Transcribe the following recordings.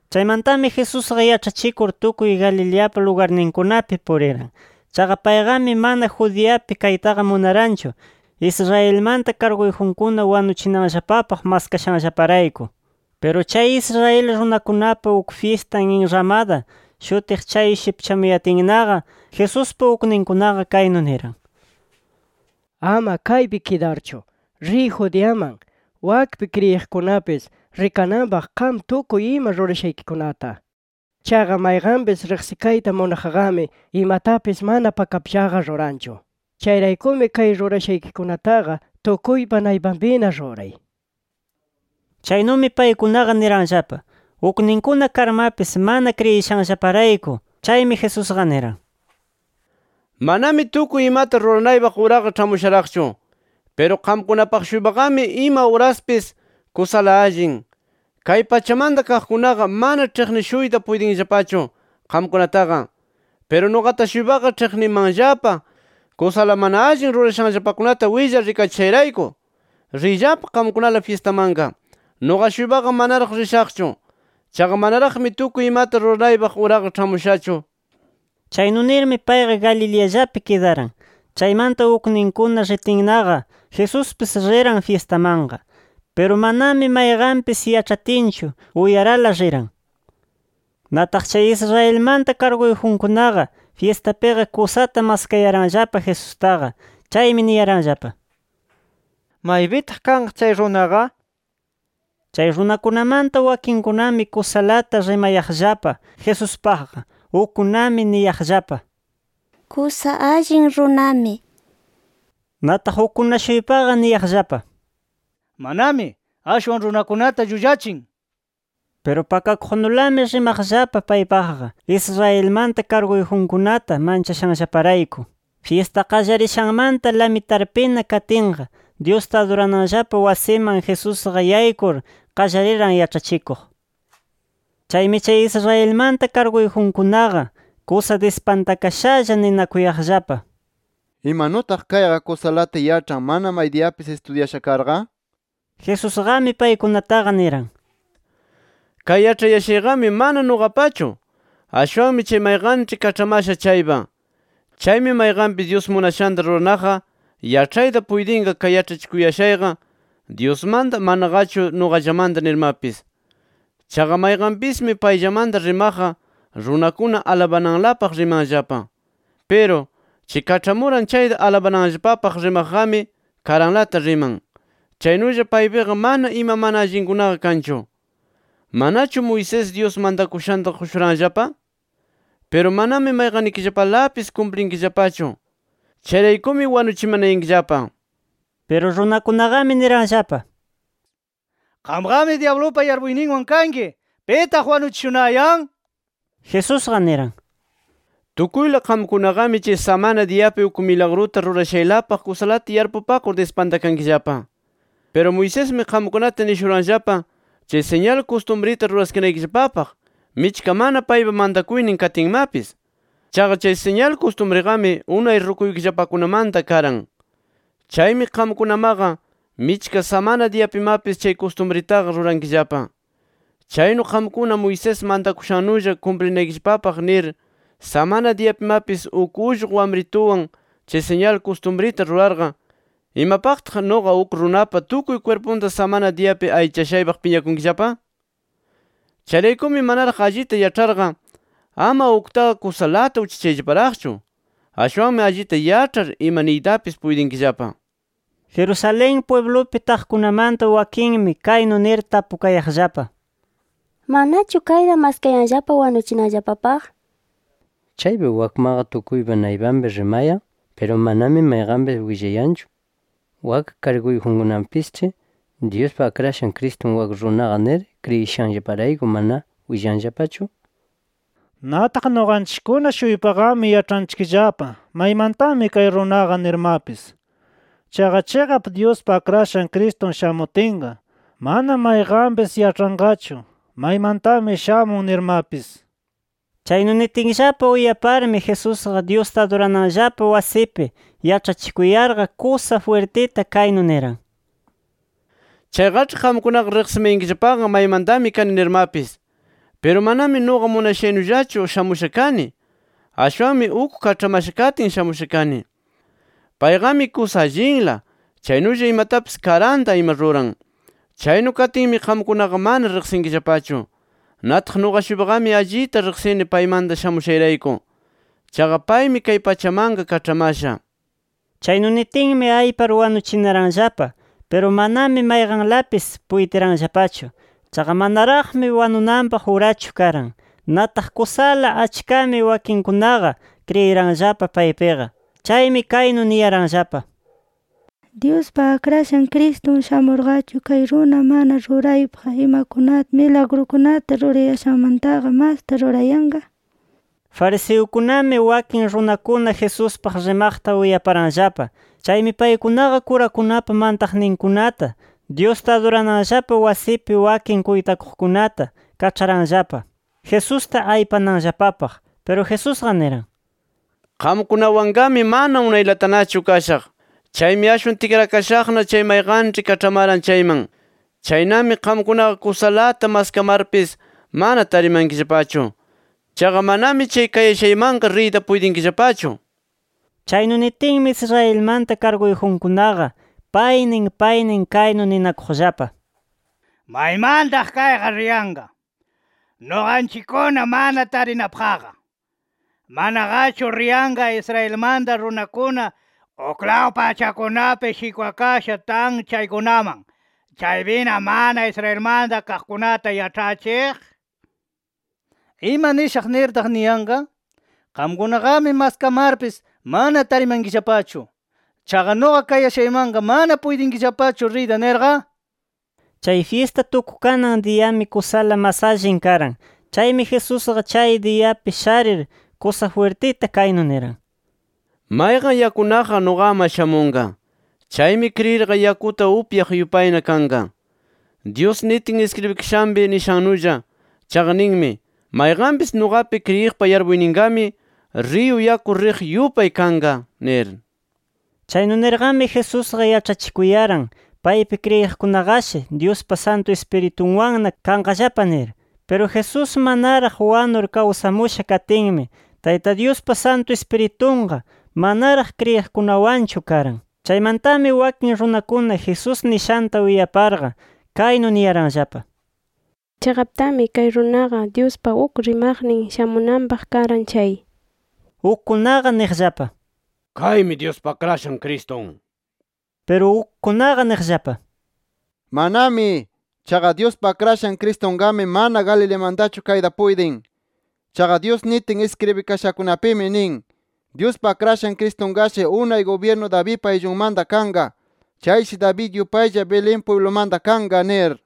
Chaymantami Jesusqa yaĉhachikur tukuy Galileapa lugarninkunapi puriran. Chaqa, payqami mana Judeapi kaytaqa munaranchu, Israelmanta karguyjunkuna wanuchinanllapapaq maskashanllaparayku. Piru chay Israel runakunapa uk fyistan Enramada shutiq chay shipchamuyatinnaqa, Jesuspa ukninkunaqa kaynu niran: —Ama kaypi kidarchu, riy Judeaman. Wakpi, kriyiqkunapis rikananpaq qam tukuy ima rurashaykikunata. Chaqa, mayqanpis riqsikayta munaqqami imatapis mana pakapllaqa ruranchu. Chayraykumi kay rurashaykikunataqa tukuypa naypanpina ruray nir. Chaynumi paykunaqa niranllapa, ukninkuna karmapis mana kriyishanllaparayku. Chaymi Jesusqa niran: —Manami tukuy imata ruranaypaq uraqa ĉhamusharaqchu. Piru qamkunapaq-shuypaqami, ima uraspis kusala allin. Kay pachamanta kaqkunaqa, mana ĉhiqnishuyta puytinllapachu qamkunataqa. Piru nuqata-shuypaqa ĉhiqnimanllapa, kusala mana allin rurashanllapakunata willar rikachishayrayku. Riyllapa qamkunala fyistamanqa. Nuqa-shuypaqa manaraq rishaqchu. Chaqa manaraqmi tukuy imata ruranaypaq uraqa ĉhamushachu nir. Chaynu nirmi, payqa Galileallapi kidaran. Chaymanta ukninkuna ritinnaqa, Jesuspis riran fyistamanqa. Piru, manami mayqanpis yaĉhatinchu, uyarala riran. Nataq chay Israelmanta karguyjunkunaqa, fyistapiqa kusata maskayaranllapa Jesustaqa. Chaymi niyaranllapa: —¿Maypitaq kanqa chay runaqa? nir. Chay runakunamanta wakinkunami kusalata rimayaqllapa Jesuspaqqa. Ukkunami niyaqllapa: “Kusa allin runami” nir. Nataq ukkuna-shuypaqa niyaqllapa: “Manami, ashwan runakunata llullachin” nir. Piru pakakuqnulami rimaqllapa paypaqqa, Israelmanta karguyjunkunata manchashanllaparayku. Fyista qallarishanmanta lamtarpina katinqa, Dyusta adurananllapa wasiman Jesusqa yaykur, qallariran yaĉhachikuq. Chaymi, chay Israelmanta karguyjunkunaqa kusa dispantakashalla ninakuyaqllapa: “¿Imanutaq kayqa kusalata yaĉhan mana maydiyapis istudyasha karqa?” nir. Jesusqami paykunataqa niran: —Kay yaĉhayashayqami mana nuqapachu, ashwanmi chay mayqanĉhi kaĉhamasha chaypa. Chaymi mayqanpis Dyus munashanta ruranaqqa, yaĉhayta puytinqa kay yaĉhachikuyashayqa, Dyusmanta manaqachu nuqallamanta nirmapis. Chaqa mayqanpismi payllamanta rimaqqa, runakuna alabananlapaq rimanllapa. Piru, chay kaĉhamuran chayta alabananllapapaq rimaqqami, karanlata riman. Chaynulla, paypiqa mana ima mana allinkunaqa kanchu. “¿Manachu Moisés, Dyus mantakushanta qushuranllapa? Piru manami mayqannikillapalapis kumplinkillapachu. Chayraykumi wanuchimanayankillapa”. Piru, runakunaqami niranllapa: —¡Qamqami dyablupa yarpuyninwan kanki! ¿Pitaq wanuchishunayan? nir. Jesusqa niran: —Tukuyla qamkunaqami chay samana diyapi uk milagruta rurashaylapaq kusalata yarpupakur dispantakankillapa. Piru Moisesmi, qamkunata nishuranllapa chay siñal kustumrita ruraskinaykillapapaq, michka mana paypa mantakuynin katinmapis. Chaqa chay siñal kustumriqami unay rukuykillapakunamanta karan. Chaymi qamkunamaqa michka samana diyapimapis chay kustumritaqa rurankillapa. Chaynu qamkuna Moisés mantakushannulla kumplinaykillapapaq nir samana diyapimapis uk ullqu wamrituwan chay siñal kustumrita rurarqa, ¿imapaqtaq nuqa uk runapa tukuy kwirpunta samana diyapi allichashaypaq piñakunkillapa? Chayraykumi manaraq allita yaĉharqa ama uktaqa kusalata uchachayllaparaqchu. Ashwanmi allita yaĉhar, ima niytapis puytinkillapa nir. Jerusalén pwiblupi taqkunamanta wakinmi kaynu nir tapukayaqllapa: “¿Manachu kayta maskayanllapa wanuchinanllapapaq? Chaypi wakmaqa tukuypa naypanpi rimayan. Piru manami mayqanpis willayanchu. Wak karguyjunkunapisĉhi ¿Dyuspa Akrashan Cristun wak runaqa nir kriyishanllaparayku mana willanllapachu? Nataq nuqanchikkuna-shuypaqami yaĉhanchikllapa maymantami kay runaqa nirmapis. Chaqa chiqap Dyuspa Akrashan Cristun shamutinqa, mana mayqanpis yaĉhanqachu maymantami shamun nirmapis”. Chaynu nitinllapa uyaparmi Jesusqa Dyusta adurananllapa wasipi yaĉhachikuyarqa, kusa jwirtita kaynu niran: “¡Chayqaĉhi qamkunaqa riqsimayankillapaqa maymantami kani nirmapis! Piru manami nuqa munashaynullachu shamusha kani. Ashwanmi uk kaĉhamasha katin shamusha kani. Payqami kusa allinla, chaynulla imatapis karanta ima ruran. Chaynu katinmi qamkunaqa mana riqsinkillapachu. Nataq nuqa-shuypaqami allita riqsini paymanta shamushayrayku. Chaqa paymi kay pachamanqa kaĉhamasha” nir. Chaynu nitinmi, aypar wanuchinaranllapa. Piru manami mayqanlapis puytiranllapachu. Chaqa manaraqmi wanunanpaq urachu karan. Nataq kusala achkami wakinkunaqa kriyiranllapa paypiqa. Chaymi kaynu niyaranllapa: —¿Dyuspa Akrashan Cristun shamurqachu, kay runa mana ruraypaq imakunata, milagrukunata rurayashanmantaqa masta rurayanqa? nir. Fariseukunami, wakin runakuna Jesuspaq rimaqta uyaparanllapa. Chaymi, paykunaqa kurakunapa mantaqninkunata, Dyusta adurananllapa wasipi wakin kuytakuqkunata kaĉharanllapa, Jesusta aypananllapapaq. Piru Jesusqa niran: —Qamkunawanqami mana unaylatanachu kashaq. Chaymi ashwan tikrakashaqna chay mayqanĉhi kaĉhamaran chayman. Chaynami qamkunaqa kusalata maskamarpis mana tarimankillapachu. Chaqa manami chay kayashaymanqa riyta puytinkillapachu nir. Chaynu nitinmi, Israelmanta karguyjunkunaqa, paynin paynin kaynu ninakuqllapa: “¿Maymantaq kayqa riyanqa, nuqanchikkuna mana tarinapaqqa? ¿Manaqachu riyanqa Israelmanta runakuna uklaw pachakunapi shikwakasha tan chaykunaman, chaypina mana Israelmanta kaqkunata yaĉhachiq? ¿Ima nishaq nirtaq niyanqa: ‘Qamkunaqami maskamarpis mana tarimankillapachu’, ‘Chaqa nuqa kayashaymanqa mana puytinkillapachu riyta’ nirqa?” Chay fyista tukukanan diyami kusala mas allin karan. Chaymi Jesusqa chay diyapi sharir kusa jwirtita kaynu niran: “Mayqan yakunaqqa, nuqaman shamunqa. Chaymi kriyirqa yakuta upyaq yupayna kanqa, Dyus nitin iskribikashanpi nishannulla. Chaqa ninmi: Mayqanpis nuqapi kriyiqpa yarpuyninpiqami riyu yaku riq yupay kanqa nir”. Chaynu nirqami Jesusqa yaĉhachikuyaran, paypi kriyiqkunaqashi Dyuspa Santu Ispiritunwanna kanqallapa nir. Piru Jesús manaraq wanur kawsamusha katinmi, Tayta Dyuspa Santu Ispiritunqa manaraq kriyiqkunawanchu karan. Chaymantami wakin runakuna Jesús nishanta uyaparqa, kaynu niyaranllapa: —Chiqaptami kay runaqa Dyuspa uk rimaqnin shamunanpaq karan chay, nir. Ukkunaqa niqllapa: —Kaymi Dyuspa Akrashan Cristun nir. Piru ukkunaqa niqllapa: —¡Manami! Chaqa Dyuspa Akrashan Cristunqami mana Galileamantachu kayta puytin. Chaqa Dyus nitin iskribikashakunapimi nin: ‘Dyuspa Akrashan Cristunqashi unay gubyirnu Davidpa ayllunmanta kanqa. Chayshi David yupaylla Belén pwiblumanta kanqa’ nir.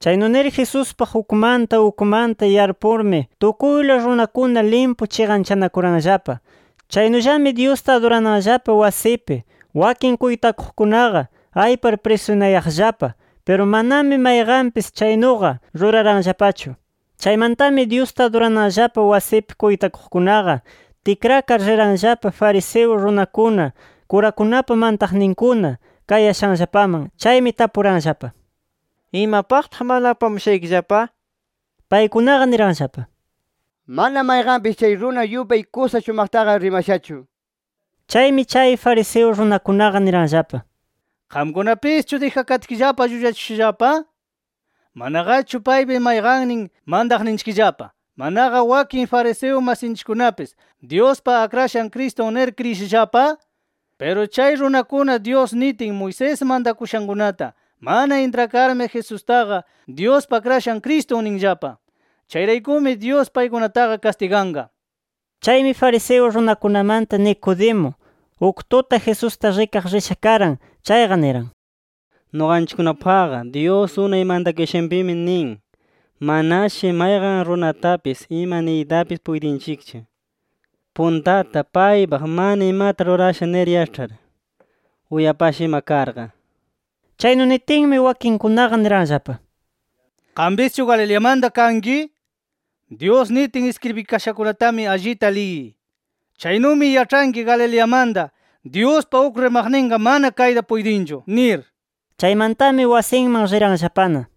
Chaynu nir Jesuspaq ukmanta ukmanta yarpurmi tukuyla runakuna limpu chiqanchanakuranllapa. Chaynullami Dyusta adurananllapa wasipi wakin kuytakuqkunaqa, aypar prisunayaqllapa. Piru manami mayqanpis chaynuqa ruraranllapachu. Chaymantami Dyusta adurananllapa wasipi kuytakuqkunaqa, tikrakar riranllapa fariseo runakuna, kurakunapa mantaqninkuna kayashanllapaman. Chaymi tapuranllapa: —¿Imapaqtaq mana apamushaykillapa? nir. Paykunaqa niranllapa: —Mana mayqanpis chay runa yupay kusa shumaqtaqa rimashachu nir. Chaymi, chay fariseo runakunaqa, niranllapa: —¿Qamkunapischu dijakatkillapa llullachishushallapa? Manaqachu ¿paypi mayqannin mantaqninchikllapa, manaqa wakin fariseo masinchikkunapis ‘Dyuspa Akrashan Cristun’ nir kriyishallapa? Piru, chay runakuna Dyus nitin Moisés mantakushankunata mana intrakarmi, Jesustaqa ‘Dyuspa Akrashan Cristun’ ninllapa. Chayraykumi Dyus paykunataqa kastiganqa. Chaymi fariseo runakunamanta Nicodemo, uk tuta Jesusta rikaq risha karan chayqa, niran: —Nuqanchikkunapaq Dyus unay mantakushanpimi nin: Manashi mayqan runatapis ima niytapis puytinchikchu, puntata paypaq mana imata rurasha nir yaĉhar, uyapasha ima karqa. Chaynu nitinmi, wakinkunaqa niranllapa: —¿Qampischu Galileamanta kanki? Dyus nitin iskribikashakunatami allita liyiy. Chaynumi yaĉhanki Galileamantaqa Dyuspa uk rimaqninqa mana kayta puytinchu nir. Chaymantami wasinman riranllapana.